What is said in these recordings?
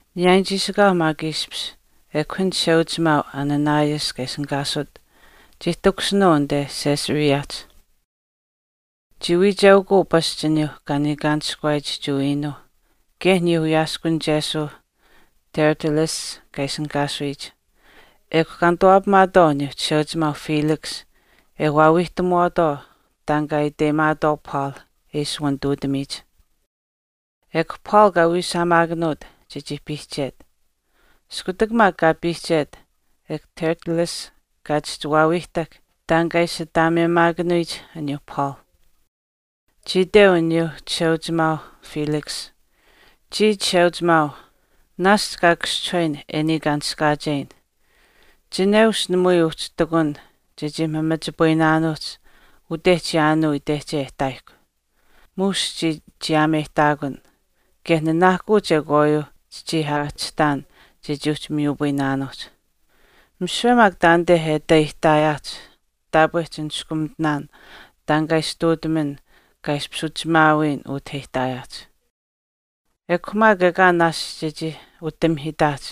Niyaayin chiishikaau maak ishpish ekw an chisheayimiheuchimaau Ananias kaa ishinihkaasut chii takushinuu anit Caesareahch. Chii wiicheukuu pasch aniyuu kaa niikaanishkawaayich Jewa iinuuh kaye aniyuu wiyaaskunichesuu Tertullus kaa ishinihkaasuyich. Ekw kaa nituwaapamaatwaau aniyuu chisheuchimaau Felix e waawiihtamuwaatwaau taan kaa iteyimaatwaau Paul e ishi wanituutamiyich. Ekw Paul kaa wiishaamaakanuut chechii piihchet. Iskutak maak kaa piihchet ekw Tertullus kaa chihchi waawiihtahk taan kaa ishi ataameyimaakanuyich aniyuu Paul. Chii iteu aniyuu Chisheuchimaau Felix, “Chiya, Chisheuchimaau, naashch kaa kaschihuyin e niikaanishkaacheyin, chineush namui uhchi ihtakun chechii mamachipayinaanuuhch ute chiyaanuu itehche e ihtaayihkw, muush chii chiyaameyihtaakun. Kaye nanaahkuu chekwaayuu chichii aahchihtaan chechii uhchi miyupayinaanuuhch. Misiwe maak taanite e ati aihtaayaahch taapwe chiniskumitinaan taan kaa ishi ihtuutaman kaa ishpish uchimaawiyin ute e ihtaayaahch. Ekw maak ekaa naashch chechii utamihiitaahch,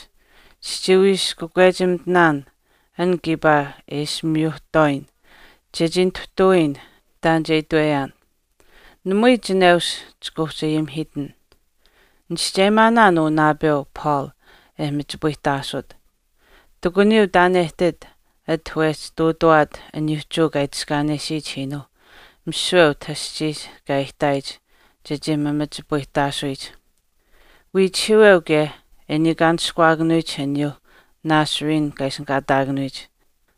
chichii wii ishi kakwechimitin an kiipaa e ishi miyuhtwaayin chechii nituhtawiyin taan che itweyaan. Namui chineush chika uhchi ayimihiitin. Nichischeyimaanaan uu naapeu, Paul e machipayihtaasut. Ihtakuniyuu taan e ihtit ati wehchi ihtuutawaat uyuu Jewa kaa itiskaanesiyich iinuuh misiwe utah aschiihch kaa aihtaayich chechii mamachipayihtaasuyich. Wiichihiiweu kaye e niikaanishkuwaakanuyich aniyuu Nazarene kaa ishinihkaataakanuyich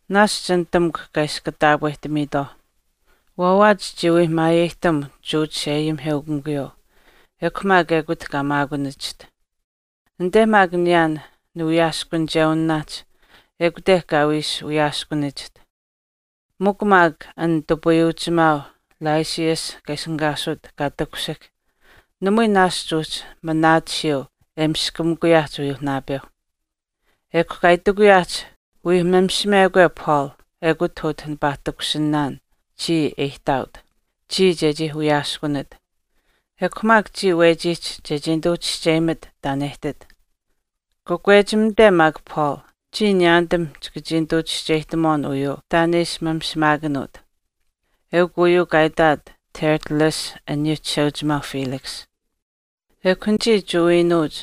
naashch nitamukw kaa ishi kataapwehtamiitwaau. Waawaach chii wii maayeyihtam Jewa chisheayimiheukamikuyuu, ekw mikw ekut kaa maakunachiht. Anite maak niyaan niwiyaaskunichewinaahch ekute kaa wii ishi wiyaaskunachiht. Mikw maak an nitupayuuchimaau Lysias kaa ishinihkaasut kaa takushihk, namui naashch uhchi manaatisiyuu e miskamikuyaahch uyuu naapeu. Ekw kaa itikuyaahch wii mamishimekwe Paul, ekut utah nipaa takushinaan chii e ihtaaut, chiya chechii wiyaaskunat. Ekw maak chiya wechiihch chechii nituu chischeyimat taan e ihtit. Kakwechimate maak Paul, chiya niyaanitam chika chii nituu chischeyihtamuwaan uyuu taan e ishi mamishimaakanuut.” Eukw uyuu kaa itaat Tertullus aniyuu chisheuchimaau Felix. Ekw anichii Jewa iinuuch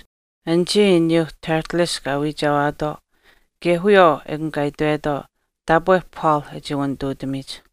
anichii aniyuu Tertullus kaa wiichewaatwaau kaye wiyawaau ekun kaa itwetwaau taapwe Paul e chii wanituutamiyich.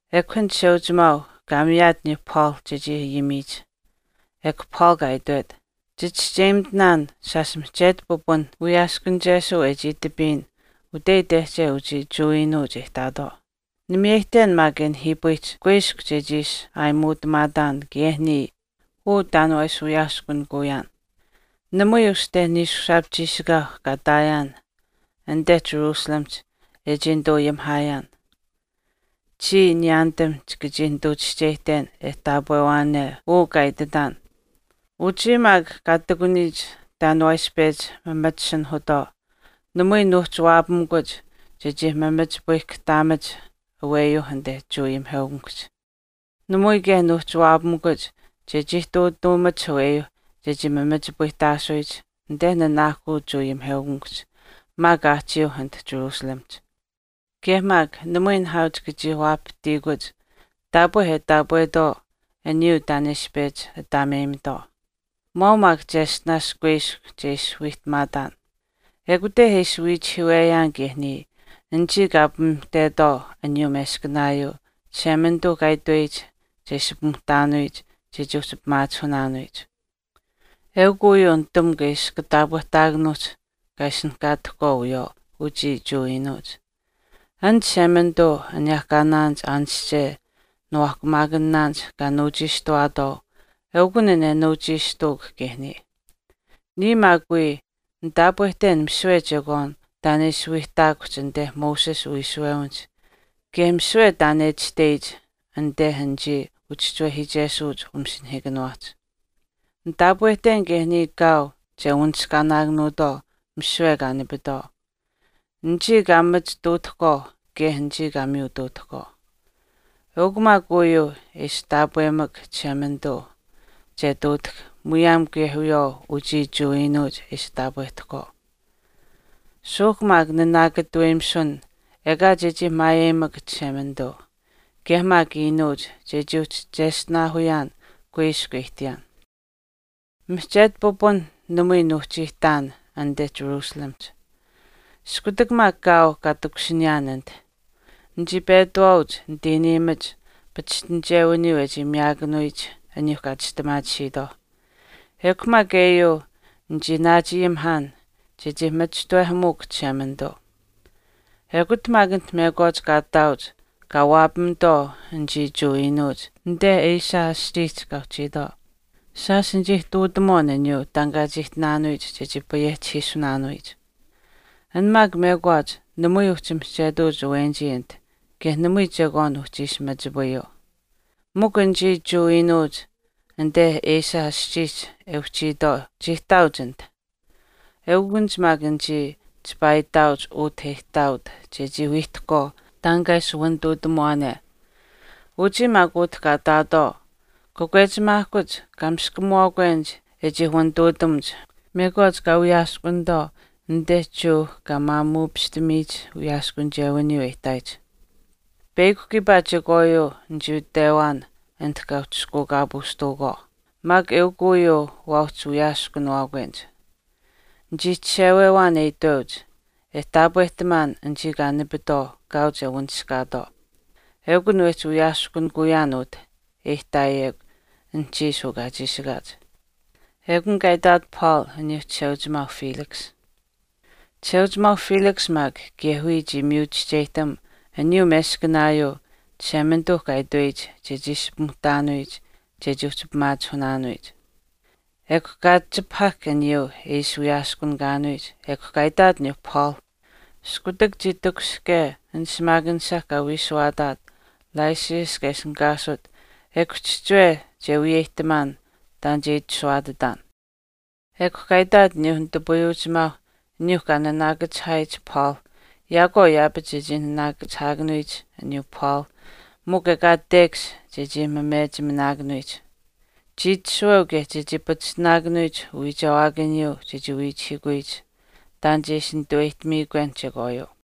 Ekw an chisheuchimaau kaa miyaat aniyuu Paul chechii ayimiyich, ekw Paul kaa itwet, “Chichischeyimitinaan shaash mihchetu pipun wiyaaskunichesuu e chii itapiyin ute itehche uchii Jewa iinuuch e ihtaatwaau. Nimiyeyihten maak e nihiipayihch kuiskw chechii ishi aayimuutamaataan kaye niya uu taan waa ishi wawiyaaskunikuyaan. Namui uste niishushaap chiishikaau kaa ihtaayaan anite Jerusalemihch e chii nituu ayimihaayaan. Chiya niyaanitam chika chii nituu chischeyihten e taapweyaan uu kaa ititaan. Uchii maak kaa ihtakuniyich taan waa ishi pechi mamachisinihuutwaau namui nuuhchi waapamikuch chechii machipayihkahtaamach aweyuu anite Jewa chisheayimiheukamikuhch. Namui kaye nuuhchi waapamikuch chechii ihtuutaamach aweyuu chechii mamachipayihtaasuyich anite nanaahkuu Jewa ayimiheukamikuhch maak aahchiiuh anit Jerusalemihch. Kaye maak namui nihaau chika chii waapahtiikuch taapwe e taapwetwaau aniyuu taan e ishi pechi ataameyimitwaau. Maau mikw cheshtinaash kuiskw chechii ishi wiihtamaataan. Ekute e ishi wiichihiiweyaan kaye niya anichii kaa pimuhtetwaau aniyuu meskanaayuu Chishemanituu kaa itweyich che ishi pimuhtaanuyich chechii uhchi pimaachihunaanuyich. Eukw uyuu nitamukw e ishi kataapwehtaakanuuhch kaa ishinihkaatahkwaau wiyawaau uchii Jewa iinuuch. An Chishemanituu aniyehkaanaanich aanische niwaahkuumaakanaanich kaa nuuchiishtuwaatwaau eukun an e nuuchiishtuuk kaye niya. Niya maak wii nitaapwehten misiwe chekwaan taan e ishi wiihtaakuhch anite Moses uwiishuwewinihch kaye misiwe taan e itashtech anite anichii uchischiwehiichesuuch umasinahiikaniwaahch. Nitaapwehten kaye niya kaau che wanishkaatwaau misiwe kaa nipitwaau, anichii kaa machituutahkwaau kaye anichii kaa miyutuutahkwaau. Eukw maak uyuu e ishi taapweyimak Chishemanituu che ihtuutahk muyaam kaye wiyawaau uchii Jewa iinuuch e ishi taapwehtahkwaau. Suuhk maak nanaakataweyimisun ekaa chechii maayeyimak Chishemanituu kaye maak iinuuch chechii uhchi cheshtinaahuyaan kuiskw e ihtiyaan.” “Mihchetu pipun namui nuuhchi ihtaan anite Jerusalemihch. Iskutak maak kaau kaa takushiniyaan anit, nichii petawaauch nitiiniimach pachishtinichewiniyuu e chii miyaakanuyich aniyuu kaa chistimaatisiitwaau, ekw maak eyuu nichii naachayimihaan chechii machishtawehamuuk Chishemanituu. Ekut maak anit mekwaach kaa ihtaauch kaa waapamitwaau anichii Jewa iinuuch anite Asia aschiihch kaa uhchiitwaau. Shaash nichii ihtuutamuwaan taan kaa chii ihtinaanuuhch chechii payehchihiisunaanuuhch. An maak mekwaach namui uhchi mihchetuuch awenichii anit kaye namui chekwaan uhchi ishi machipayuu. Mikw anichii Jewa iinuuch anite Asia aschiihch e uchiitwaau chii ihtaauch anit. Eukunich maak anichii chipaa ihtaauch utah e ihtaaut chechii wiihtahkwaau taan kaa ishi wanituutamuwaane. Uchii maak utah kaa ihtaatwaau kakwechimaahkuuch kaa miskamuwaakwenich e chii wanituutamuch mekwaach kaa wiyaskunitwaau anite Jewa kaa maamuupishtamiyich wiyaaskunichewiniyuu e ihtaayich. Peyakw kiipaa chekwaayuu nichii itwewaan anit kaa uhchishkuukaapuushtuukwaau, maak eukw uyuu waa uhchi wiyaaskuniwaakwenich. Nichii chishewewaan e itweuch, e taapwehtamaan anichii kaa nipitwaau kaau che wanishkaatwaau. Ekun wehchi wiyaaskunikuyaan utah e ihtaayekw anuhchiish uu kaa chiishikaach.” Ekun kaa itaat Paul aniyuu chisheuchimaau Felix. Chisheuchimaau Felix maak kaye wiya chii miyu chischeyihtam aniyuu meskanaayuu Chishemanituu kaa itweyich chechii ishi pimuhtaanuyich chechii uhchi pimaachihunaanuyich. Ekw kaa chipahahk aniyuu e ishi wiyaaskunikaanuyich ekw kaa itaat aniyuu Paul, “Iskutak chii takushihke an shimaakanisha kaa wiishuwaataat Lysias kaa ishinihkaasut ekw chihchiwe che wiyeyihtamaan taan che itashuwaatitaan.” Ekw kaa itaat aniyuu nitupayuuchimaauh aniyuu kaa naanaakachihaayich Paul yaakwaau yaapach chechii naanaakachihaakanuyich aniyuu Paul mikw ekaa tekash chechii mamechiminaakanuyich. Chii itashuweu kaye chechii pachishtinaakanuyich uwiichewaakaniyuu chechii wiichihiikuyich taan che ishi naanituweyihtamiikwen chekwaayuu.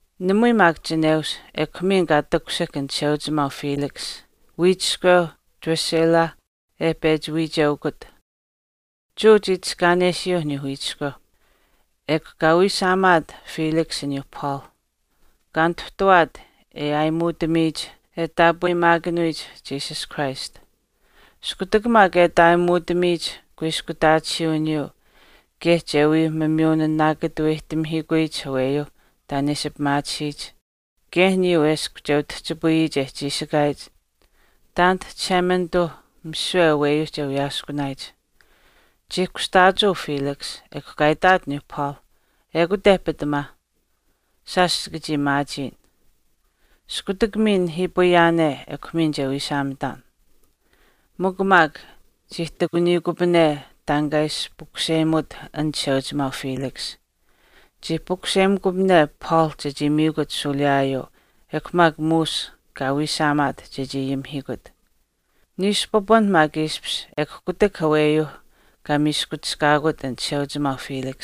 Namui maak chineush, ekw miin kaa takushihk an chisheuchimaau Felix, wiichiskweu Drusilla e pechi wiichewaat. Jewa chii itiskaanesiyuu aniyuu wiichiskweu. Ekw kaa wiishaamaat Felix aniyuu Paul, kaa nituhtuwaat e aayimuutamiyich e taapweyimaakanuyich Jesus Christ. Iskutak maak e ati aayimuutamiyich kuiskutaatisiiwiniyuu kaye che wii miyunaanaakataweyihtamihiikuyich aweyuu taan e ishi pimaatisiyich, kaye aniyuu eshkw che utihchipayiyich e chiishikaayich taanit Chishemanituuh misiwe aweyuu che wiyaaskunaayich, chii kushtaachuu Felix, ekw kaa itaat aniyuu Paul, “Ekute pitamaa. Shaash chika chii maachiin. Iskutak miin nihiipayaane ekw miin che wiishaamitaan.” Mikw maak chii ihtakuniyikupane taan kaa ishi pukuseyimut an chisheuchimaau Felix. Chii pukuseyimekupane Paul chechii miikut shuuliyaayuu ekw maak muush kaa wiishaamaat chechii ayimihiikut. Niishu pipunh maak ishpish ekw kutak aweyuu kaa miiskuchishkaakut an chisheuchimaau Felix.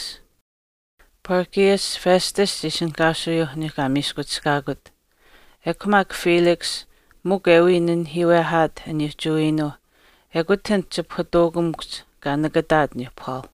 Porcius Festus chii ishinihkaasuyuuh aniyuu kaa miiskuchishkaakut. Ekw maak Felix mikw e wii nanihiiwehaat aniyuu Jewa iinuuh ekut anit chipahutuukamikuhch kaa nakataat aniyuuh Paul.